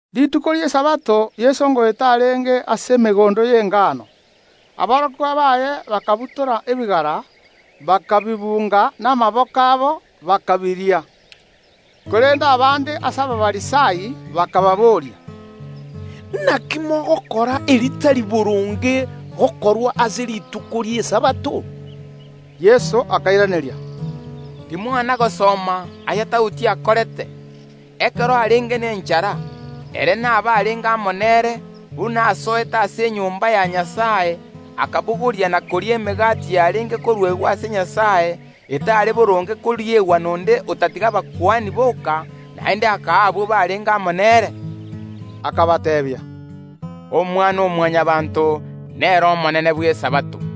Rituko ri’Esabato Yeso ngoeta arenge ase emegondo y’engano; aborokigwa baye bakabutora ebigara, bakabibunga namaboko abo, bakaria. Korende abande ase Abafarisai bakababoria, “Naki mogokora aya’atagwenereti gokorwa ase rituko ri’Esabato?” Yeso akairaneria, “Timwana gosoma aya Daudi akorete, ekero arenge nenchara, ere na abarenge amo nere, buna asoete ase enyomba ya Nyasae, akabogoria na koria emegati yarenge koruegwa ase Nyasae, etare boronge koriegwa nonde otatiga nabakuani boka, naende akaa abwo barenge amo nere?” Akabateebia, “Omwana‐o‐Mwanyabaanto nere Omonene bw’Esabato.”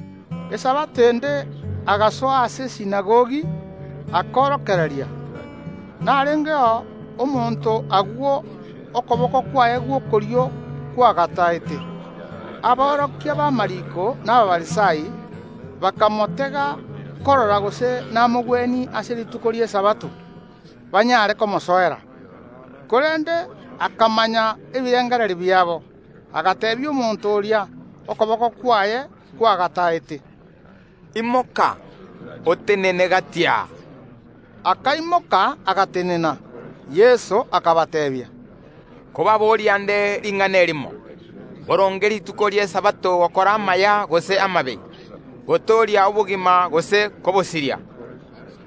Esabato ende agasoa ase esinagogi, akaorokereria. Narengeo omonto agwo, okoboko kwaye gw’okorio kwagataete. Aborokia b’amariiko na Abafarisai bakamotega korora gose namogwenie ase rituko ri’Esabato, banyare komosoera. Korende akamanya ebirengererio biabo, agateebia omonto oria okoboko kwaye kwagataete, “Imoka, otenene gati aa!” Akaimoka agatenena. Yeso akabateebia, “Nkobaboria nde ring’ana erimo: Mboronge rituko ri’Esabato gokora amaya gose amabe, gotooria obogima gose kobosiria?”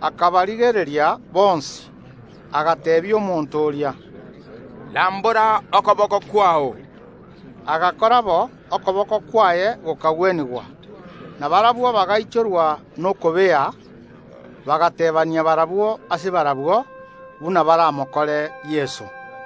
Akabarigereria bonsi, agateebia omonto oria, “Rambora okoboko kwao!” Agakora bo; okoboko kwaye gokagwenigwa. Na barabwo bagaichorwa nokobea, bagateebania barabwo ase barabwo, buna baramokore Yeso.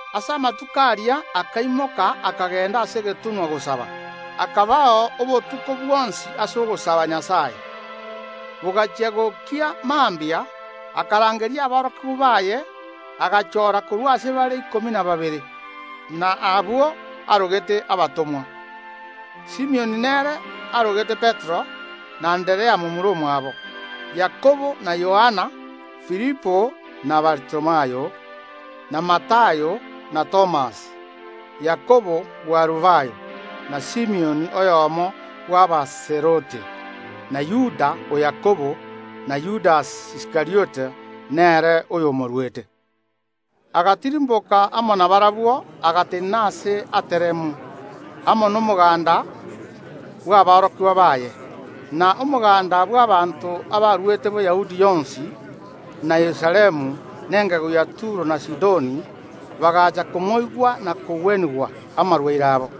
Ase amatuko aria akaimoka akagenda ase egetunwa gosaba; akabao obotuko bwonsi ase ogosaba Nyasae. Bogachia gokia mambia akarangeria aborokigw baye, agachora korwa ase bare ikomi na babere, abwo arogete abatomwa. Simioni nere arogete Petero, na Anderea momura omwabo; Yakobo na Yohana, Filipo na Baritholomayo, na Matayo na Thomas, Yakobo bw’Alufayo, na Simioni oyomo bw’Abazelote, na Yuda o Yakobo, na Yudasi Iskariota, nere oyo omoruete. Agatirimboka amo nabarabwo, agatenena aase ateremu, amo nomoganda bw’aborokigwa baye; na omoganda bw’abaanto abaruete Boyahudi yonsi, na Yerusalemu, na engegu ya Turo na Sidoni, bagacha komoigwa na kogwenigwa amarwaire abo.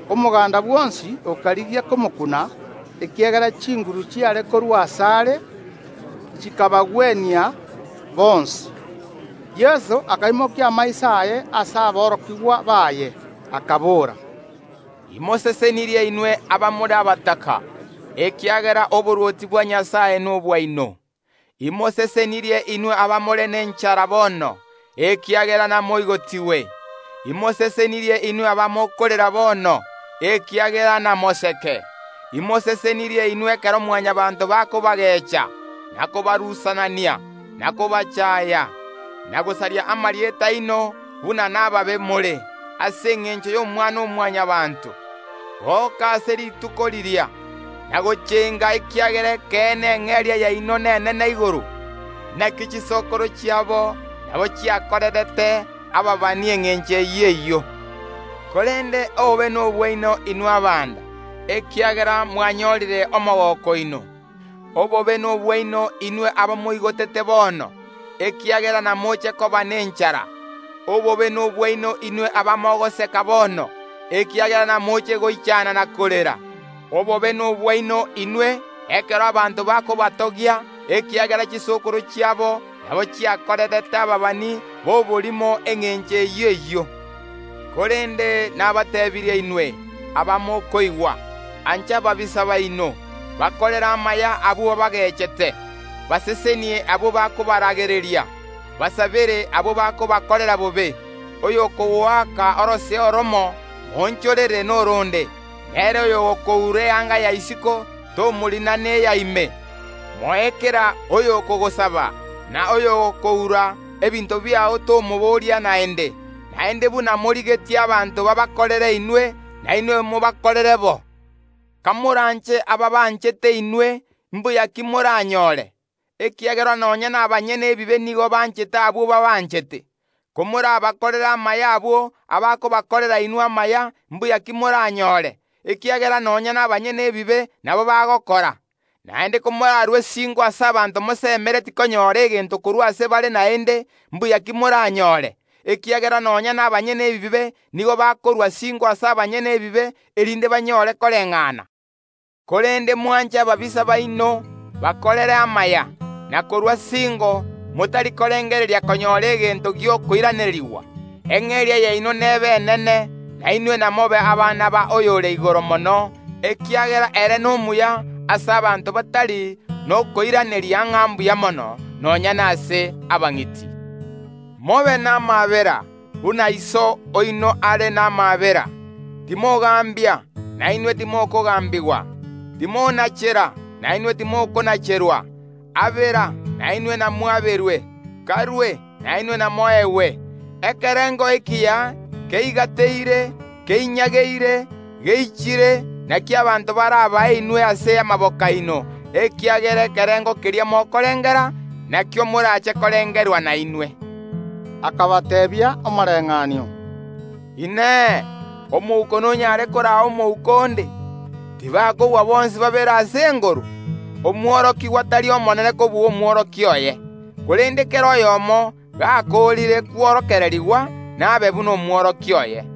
Omoganda bwonsi okarigia komokuna, ekiagera chinguru chiare korua asare, chikabagwenia bonsi. Yeso akaimokia amaiso aye ase aborokigwa baye, akabora, Imosesenirie inwe abamore abataka, ekiagera oborwoti bwa Nyasae nobwaino. Imosesenirie inwe abamore nenchara bono, ekiagera namoigotigwe. “Imosesenirie inwe abamokorera bono, ekiagera namoseke. “Imosesenirie inwe ekero Mwanyabaanto bakobagecha, na kobarusanania, na kobachaya, na gosaria amarieta aino buna nababe more, ase engencho y’Omwana‐o‐Mwanyabaanto. Goka ase rituko riria, na gochenga, ekiagera ekeene eng’eria yaino nenene igoro; naki chisokoro chiabo nabo chiakorerete ababani engencho eyio eyio. “Korende obobe nobwaino inwe abanda, ekiagera mwanyorire omogooko oino. “Obobe nobwaino inwe abamoigotete bono, ekiagera namoche koba nenchara. “Obobe nobwaino inwe abamogoseka bono, ekiagera namoche goichana na korera. “Obobe nobwaino inwe, ekero abanto bakobatogia, ekiagera chisokoro chiabo nabo chiakorerete ababani b’oborimo engencho eyio eyio. “Korende nabateebirie inwe abamokoigwa: Ancha ababisa baino, bakorere amaya abwo baabagechete, basesenie abwo bakobaragereria, basabere abwo bakobakorera bobe. Oyo okogoaka orosea oromo, moonchorere noronde, na ere oyogokoura eanga ya isiko, tomorina neya ime. Moe kera oyokogosaba; na oyogokoura ebinto biao tomoboria naende. Naende buna morigetie abanto babakorere inwe, nainwe mobakorere bo. “Komoranche abaabanchete inwe, imbuya ki moranyore? Ekiagera nonya nabanyene ebibe nigo banchete abwo baabanchete. Komorabakorere amaya abwo abakobakorera inwe amaya, imbuya ki moranyore? Ekiagera nonya nabanyene ebibe nabo bagokora. Naende komorarue singo ase abanto mosemeretie konyora egento korwa ase bare naende, imbuya ki moranyore? Ekiagera nonya nabanyene ebibe nigo bakorua singo ase abanyene ebibe, erinde banyore koreng’ana. Korende mwanche ababisa baino, bakorere amaya, na korua singo, motari korengereria konyora egento gi’okoiranerigwa, eng’eria yaino nebe enene, na inwe namobe abana b’Oyore Igoro Mono, ekiagera ere nomuya ase abanto batari nokoiraneria ng’a mbuya mono, nonya nase abang’iti. Mobe namaabera, buna Iso oino are namaabera. “Timogambia, nainwe timokogambigwa; timonachera, nainwe timokonacherwa; abera, nainwe namwaberwe; karue, nainwe namoegwe. Ekerengo ekiya keigateire, keinyageire, geichire, nakio abanto barabae inwe ase amaboko aino, ekiagera ekerengo keria mokorengera, nakio morache korengerwa nainwe.” Akabateebia omoreng’anio, “Inee! Omouko nonyare koraa omouko onde? Tibakogwa bonsi babere ase engoro? Omworokigwa tari omonene kobua omworokia oye, korende kera oyomo gakoorire kworokererigwa nabe buna omworokia oye.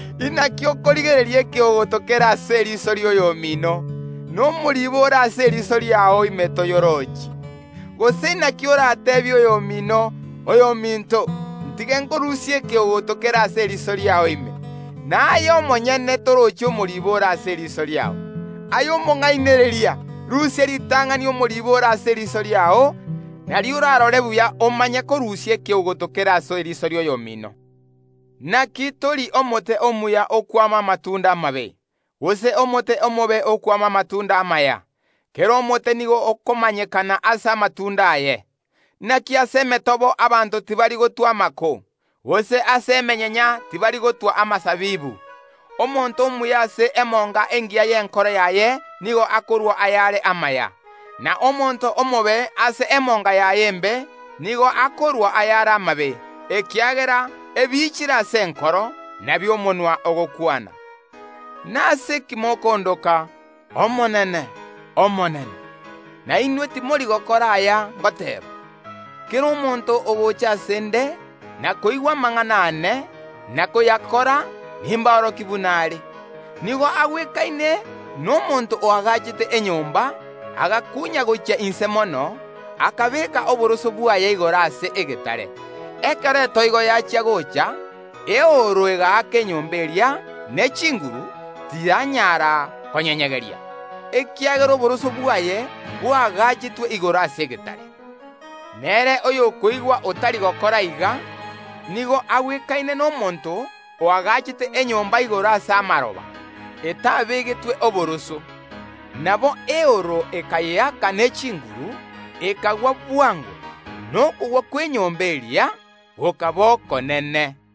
Inaki okorigereria ekeogoto kere ase eriso ri’oyomino, na omoribo ore ase eriso riao ime toyorochi? Gose naki orateebie oyomino: Oyominto, ntige nkorusie ekeogoto kere ase eriso riao ime, na aye omonyene torochi omoriibo ore ase eriso riao? Aye omong’ainereria, rusia ritang’ani omoribo ore ase eriso riao, nario orarore buya omanye korusia ekeogoto kere ase eriso ri’oyomino. “Naki tori omote omuya okwama amatunda amabe, gose omote omobe okwama amatunda amaya. Kera omote nigo okomanyekana ase amatunda aye. Naki ase emetobo abanto tibari gotwa amako, gose ase emenyenya tibari gotwa amasabibu. Omonto omuya ase emonga engiya y’enkoro yaye nigo akorua ayare amaya; na omonto omobe ase emonga yaye embe nigo akorua ayare amabe, ekiagera ebiichire ase enkoro, nabio omonwa ogokwana. “Nase ki mokondoka Omonene Nyasae, na inwe timori gokora aya ngoteeba? Kera omonto ogocha ase ’nde, na koigwa amang’ana aane, na koyakora, nimborokie buna are: Nigo agwekaine nomonto oagachete enyomba, agakunya gochia inse mono, akabeeka oboroso bwaye igoro ase egetare. Ekero etoigo yachia gocha, eooro egaaka enyomba eria ne chinguru, tiyanyara koyenyegeria, ekiagera oboroso bwaye bwaagachetwe igoro ase egetare. Nere oyokoigwa otari gokora iga, nigo agwekaine nomonto oagachete enyomba igoro ase amaroba, etabegetwe oboroso. Nabo eooro ekayeaka ne chinguru, ekagwa bwango, na okogwa kw’enyomba eria gokaba okonene.”